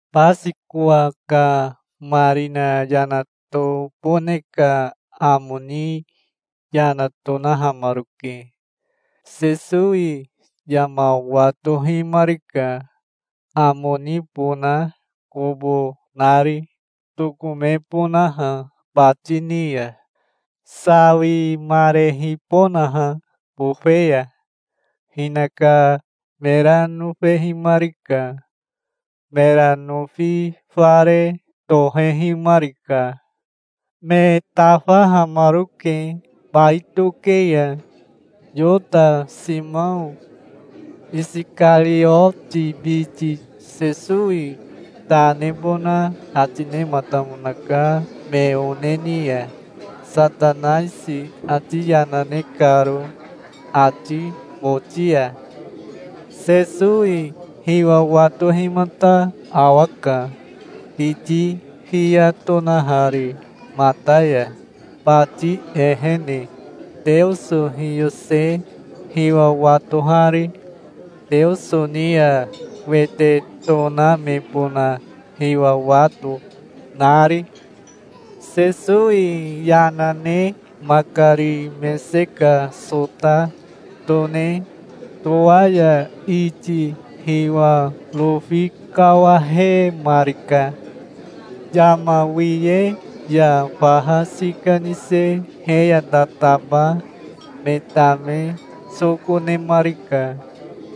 Basikowa ka marina yana tobone ka amo ni yana tonahamaroke. Sesowi yama watohimarika, amo nibona kobo nari, tokomebonaha bati ni ya, sawimarehibonaha bofe ya. Hinaka mera nofehimarika. Mera nofi fare tohehimarika. Me tafahamaroke bai toke ya. Yota Simao Isikarioti biti Sesowi ta nebona ati nematamonaka me one ni ya, Satanaisi ati yana ne karo ati boti ya. Sesowi hiwa watohimata awaka, kiti fiya tonahari mata ya, bati ehene, Teoso hiyose hiwa watohari, Teoso ni ya wete tonamebona hiwa wato, nari. Sesowi yana ne makari mese ka sota tone towaya iti hiwa rofi kawahemarika. Yama wiye ya faha sika nise he ya tataba me tame soko nemarika.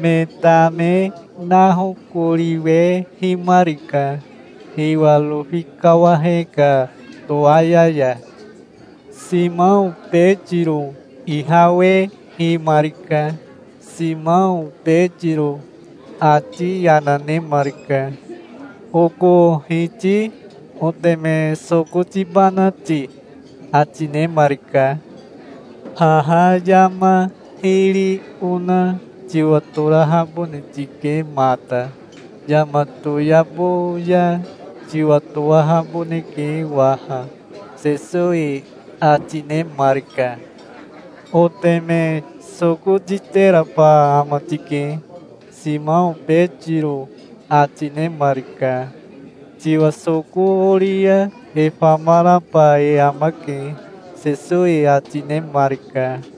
Me tame nahokoriwehimarika, hiwa rofi kawahe ka towaya ya. Simao Betiro ihawehimarika. Simao Betiro ati yana nemarika. "Oko Hiti oteme soko tibana ti?" ati nemarika. "Haha yama hiri ona tiwatorahabone tike mata. Yama toyabo ya tiwatowahaboneke waha", Sesowi ati nemarika. "Oteme soko titeraba ama tike", Simao Betiro ati nemarika. "Tiwa soko ori ya e famaraba e amake", Sesowi ati nemarika.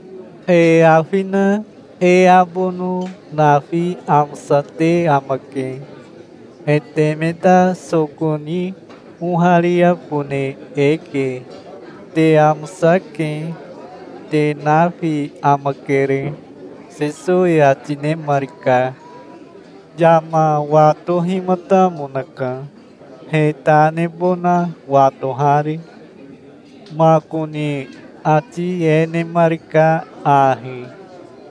"E afi na e abono nafi amosate amake. E teme ta soko ni ohariabone eke. Te amosake. Te nafi amakere", Sesowi ati nemarika. Yama watohimatamonaka, he ta nebona watohari. Makoni ati e nemarika ahi: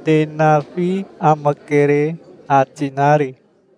"Te nafi amakere", ati nari.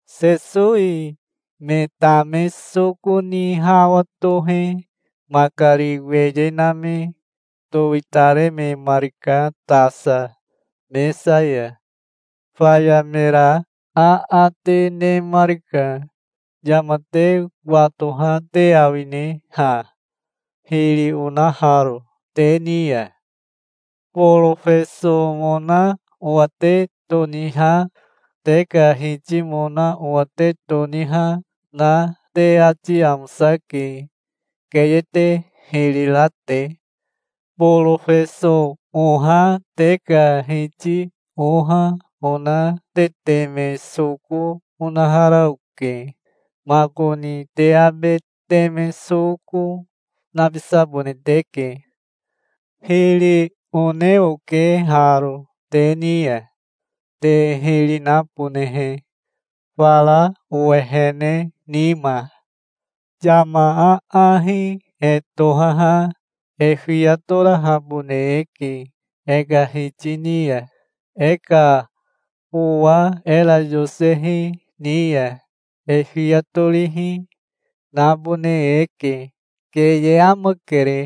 Sesowi me tame soko ni hawa tohe makari weye name towitarememarika tasa mesa ya. Faya mera aate nemarika. "Yama te watoha te awine ha, hiri onaharo te ni ya? Borofesomona owa te toniha, te ka hitimona owa te toniha na te ati amosake, keye te hiri ra te. Borofeso oha te ka Hiti oha ona te teme soko onahara oke. Makoni te abe teme soko, nabisabone teke. Hiri one oke haro te ni ya, te hiri nabonehe, fara owehene nima. Yama aahi e tohaha e fiya torahabone eke e ka hiti ni ya. E ka owa era yosehi ni ya e fiya torihi, nabone eke. Keye amakere.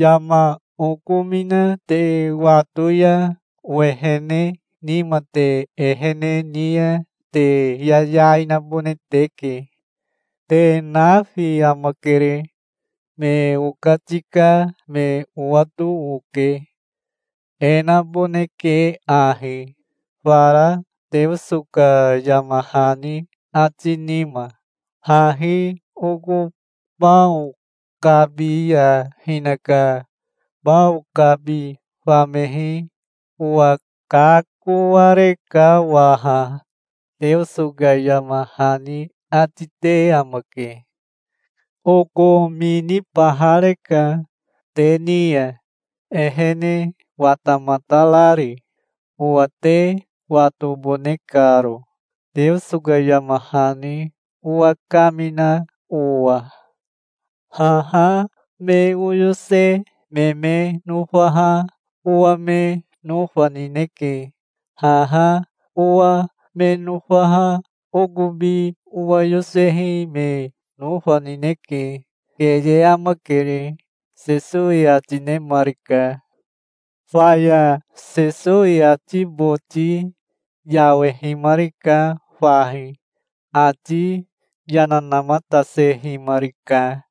Yama okomina te wato ya owehene nima te ehene ni ya te yayai nabone teke. Te nafi amakere. Me okatika me owato oke. E naboneke ahi, fara Teoso ka yama hani ati nima. 'Hahi oko bao kabi ya hinaka bao kabi famehi owa kakoareka waha', Teoso ka yama hani ati te amake. Okominibahareka te ni ya, ehene watamatarari, owa te watobone karo, Teoso ka yama hani owa kamina owa. Haha me oyose me me nofaha owa me nofa nineke. Haha owa me nofaha okobi owa yosehi me nofa nineke. Keye amakere", Sesowi ati nemarika. Faya Sesowi ati boti yawehimarika fahi. Ati yana namatasehimarika,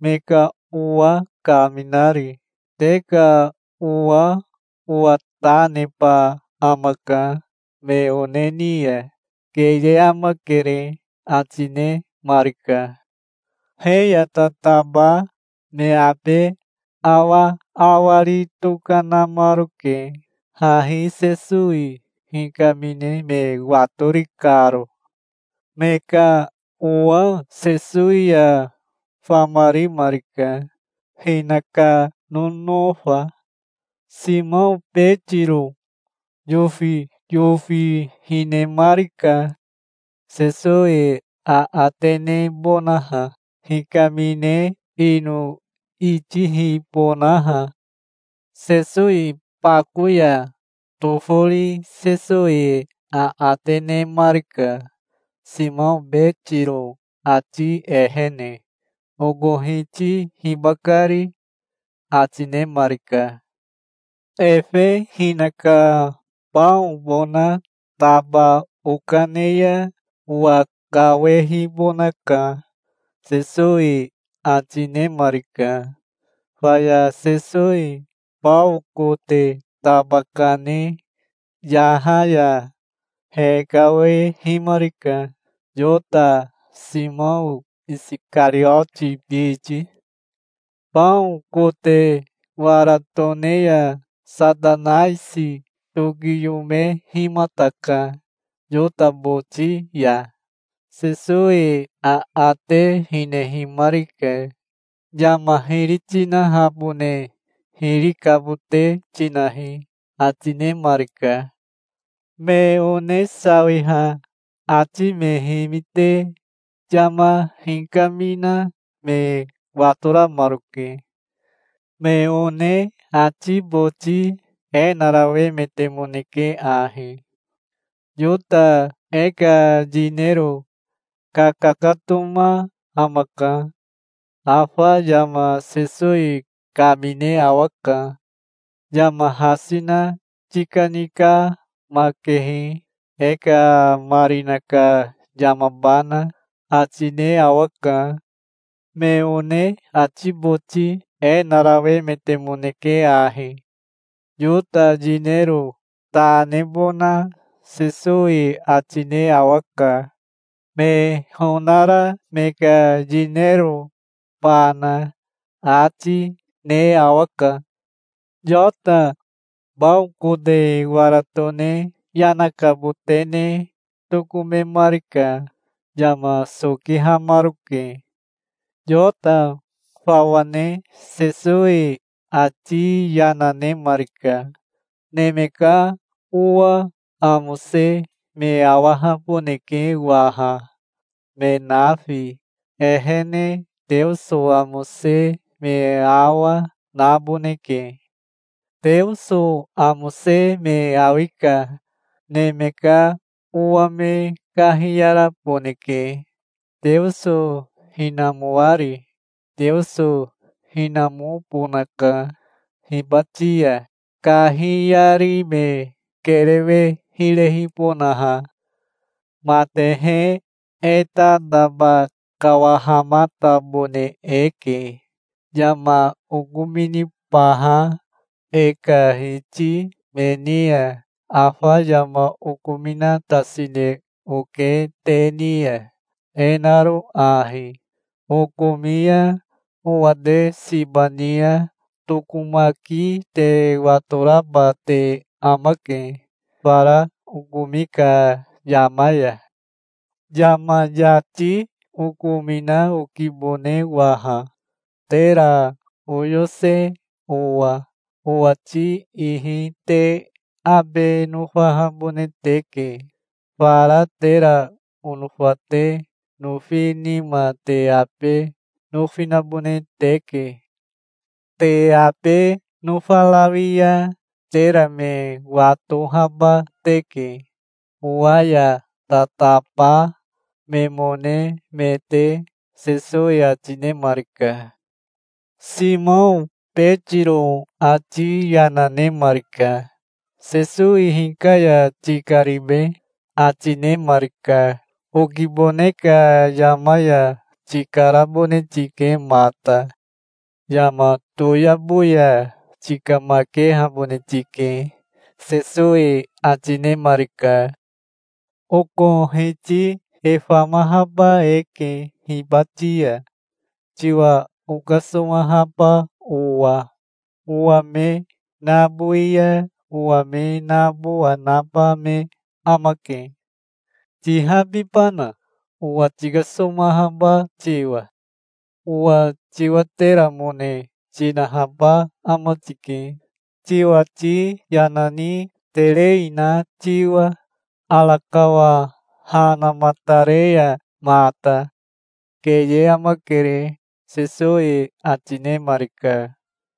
me ka owa kaminari. "Te ka owa owa ta neba amaka me one ni ya. Keye amakere", ati nemarika. He ya tataba me abe awaawari tokanamaroke, hahi Sesowi hikamine me watori karo. Me ka owa Sesowi ya famarimarika, hinaka nonofa. Simao Betiro yofiyofi hinemarika, Sesowi aate nebonaha, hikamine ino itihibonaha. Sesowi bako ya tofori Sesowi aate nemarika, Simao Betiro ati ehene. "Oko Hiti hibakari?" ati nemarika. "Efe hinaka baobona taba okane ya owakawehibonaka", Sesowi ati nemarika. Faya Sesowi bao kote taba kane yaha ya hekawehimarika, Yota, Simao Isikarioti biti. Bao kote wara tone ya Satanaisi tokiyomehimataka Yota boti ya. Sesowi aate hinehimarika. "Yama hiri tinahabone hiri kabote tinahi", ati nemarika. Me one sawiha ati me himite yama hikamina me watoramaroke. Me one ati boti e narawemetemoneke ahi: "Yota e ka yinero kakakatoma amaka. Afa yama Sesowi kamine awaka. 'Yama hasi na tikanikamakehi, e ka marina ka yamabana', ati ne awaka". Me one ati boti e narawemetemoneke ahi: "Yota yinero ta nebona Sesowi ati ne awaka, me honara me ka yinerobana, ati, ne awaka". Yota bao kote wara tone yana kabote ne tokomemarika. Yama sokihamaroke. Yota fawa ne Sesowi ati yana nemarika. "Neme ka Owa amose me awahaboneke waha, me nafi. Ehene Teoso amose me awa naboneke. Teoso amose me awi ka Neme ka Owa me kahiyaraboneke, Teoso hinamoari. Teoso hinamobonaka hibati ya, kahiyari me kerewe hirehibonaha. Matehe, e tataba kawahamatabone eke. Yama okominibaha e ka hiti me ni ya afa yama okominatasine oke te ni ya, e naro ahi: Okomi ya owa te siba ni ya tokomaki te watoraba te amake fara okomi ka yama ya. Yama yati okomina okibone waha, tera oyose owa. Owati ihi te abe nofahabone teke. Fara tera onofa te nofi nima te abe nofi nabone teke. Te abe nofarawi ya tera me watohaba teke, owa ya tataba memone me te", Sesowi ati nemarika. Simao Betiro ati yana nemarika. "Sesowi hika ya tikaribe?" ati nemarika. "Okibone ka yama ya tikarabone tike mata. Yama toyabo ya tikamakehabone tike", Sesowi ati nemarika. "Oko Hiti e famahaba eke hibati ya, tiwa okasomahaba owa. Owa me nabowi ya owa me nabowa naba me amake". "Tihabibana, owa tikasomahaba tiwa? Owa tiwateramone tinahaba ama tike, tiwati yana ni terei na tiwa, arakawa ha namatare ya mata. Keye amakere", Sesowi ati nemarika.